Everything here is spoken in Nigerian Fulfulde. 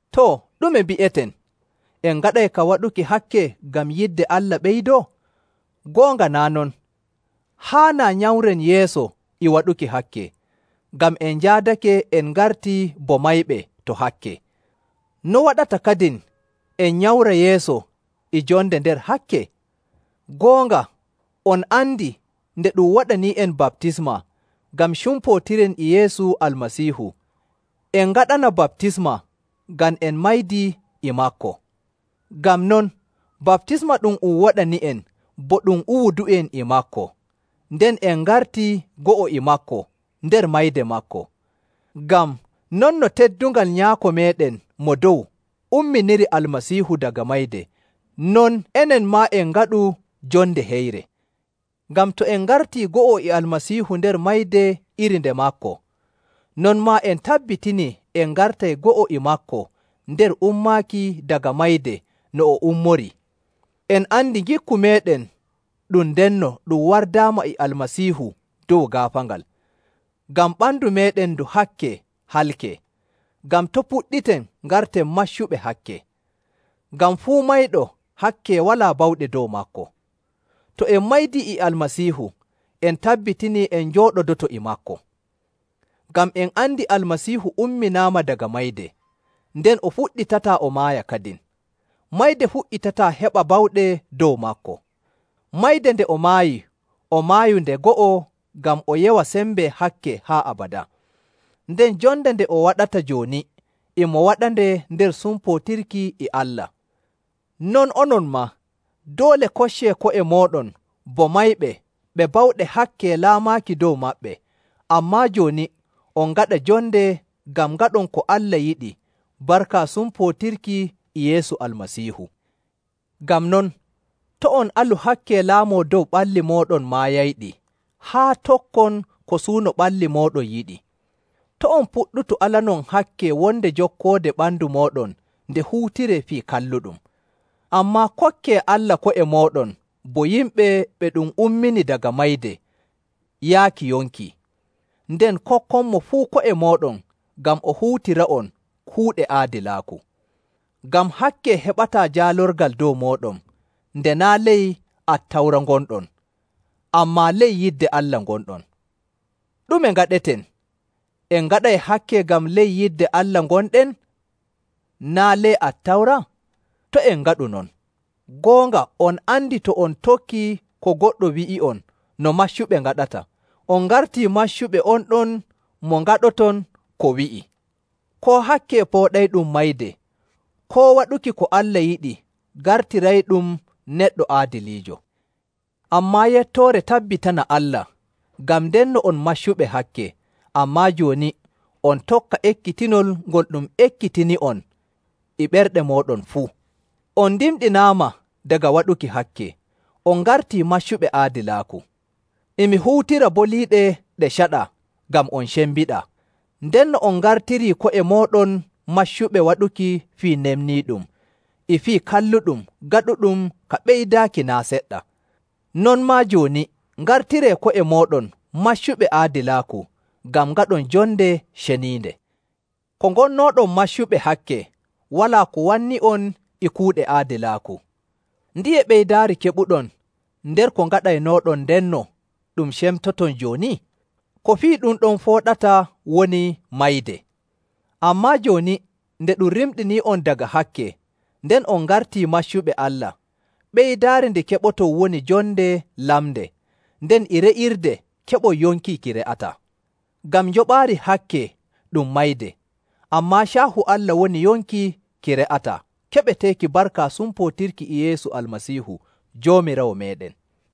Too, ɗume mbi'eten? En ngaɗay ka waɗuki hakke ngam yidde Allah ɓeydoo? Goonga naa' non! Haanaa nyamren yeeso e waɗuki hakke, ngam en njaadake en ngartii bo mayɓe to hakke. No waɗata kadin en nyamra yeeso e jonde nder hakke? Goonga on andi nde ɗum waɗanii'en baptisma ngam cumpootiren e Yeesu Almasiihu, en ngaɗana baptisma ngam en maydi e maako. Ngam non, baptisma ɗum um waɗani'en bo ɗum uwudu'en e maako, nden en ngartii go'o e maako nder mayde maako, ngam, non no teddungal Nyaako meeɗen Mo Dow umminiri Almasiihu daga mayde, non enen maa en ngaɗu jonde heyre.. Ngam to en ngartii go'o e Almasiihu nder mayde iri nde maako, non maa en tabbitinii en ngartay go'o e maako nder ummaaki daga mayde no o ummorii. En andi ngikku meeɗen ɗum ndenno ɗum wardaama e Almasiihu dow gaafaangal, ngam ɓandu meeɗen ndu hakke halkee, ngam to' puɗɗiten ngarten maccuɓe hakke. Ngam fuu mayɗo, hakke walaa bawɗe dow maako. To en maydii e Almasiihu, en tabbitinii en njooɗodoto e maako. Ngam en andi Almasiihu umminaama daga mayde, nden o fuɗɗitataa o maaya kadin. Mayde fuɗɗitataa heɓa bawɗe dow maako. Mayde nde o maayi o maayu nde go'o ngam o yewa sembe hakke haa abadaa, nden jonde nde o waɗata jooni e mo waɗande nder sumpootirki e Allah. Non onon maa, doole koccee ko'e mooɗon bo mayɓe ɓe bawɗe hakke laamaaki dow maɓɓe, ammaa jooni on ngaɗa jonde ngam ngaɗon ko Allah yiɗi barka sumpootirki e Yeesu Almasiihu. Ngam non, to' on alu hakke laamoo dow ɓalli mooɗon maayayɗi haa tokkon ko suuno ɓalli mooɗon ngiɗi. To' on puɗɗutu alanon hakke wonde jokkoode ɓandu mooɗon nde huutiree fii kalluɗum. Ammaa kokkee Allah ko'e mooɗon bo yimɓe ɓe ɗum ummini daga mayde yaaki yonki, nden kokkonmo fuu ko'e mooɗon ngam o huutira'on kuuɗe aadilaaku. Ngam hakke heɓataa jaalorgal dow mooɗon, nde naa' ley Attawra ngonɗon, ammaa ley yidde Allah ngonɗon. Ɗume ngaɗeten? En ngaɗay hakke ngam ley yidde Allah gonɗen naa' ley Attawra? To' en ngaɗu non! Goonga on andi to on tokkii ko goɗɗo wi'i'on no maccuɓe ngaɗata, on ngartii maccuɓe on ɗon mo ngaɗoton ko wi'i, koo hakke pooɗayɗum mayde, koo waɗuki ko Allah yiɗi gartirayɗum neɗɗo aadiliijo. Ammaa yettoore tabbitana Allah, ngam ndenno on maccuɓe hakke, ammaa jooni on tokka ekkitinol ngol ɗum ekkitini'on e ɓerɗe mooɗon fuu. On ndimɗinaama daga waɗuki hakke, on ngartii maccuɓe aadilaaku. E mi huutira boliiɗe ɗe caɗaa ngam on cembiɗaa. Ndenno on ngartirii ko'e mooɗon maccuɓe waɗuki fii nefniiɗum e fii kalluɗum gaɗuɗum ka ɓeydaaki naa' seɗɗa. Non maa, jooni ngartiree ko'e mooɗon maccuɓe aadilaaku ngam ngaɗon jonde ceniinde. Ko ngonnooɗon maccuɓe hakke, walaa ko wanni'on e kuuɗe aadilaaku. Ndiye ɓeydaari keɓuɗon nder ko ngaɗaynooɗon ndenno ɗum cemtoton jooni? Ko fii ɗum ɗon fooɗata woni mayde! Ammaa jooni nde ɗum rimɗinii'on daga hakke, nden on ngartii maccuɓe Allah, ɓeydaari ndi keɓoton woni jonde lamnde, nden e re'irde keɓon yonki ki re'ataa. Ngam njoɓaari hakke ɗum mayde, ammaa caahu Allah woni yonki ki re'ataa keɓeteeki barka sumpootirki e Yeesu Almasiihu Joomiraawo meeɗen.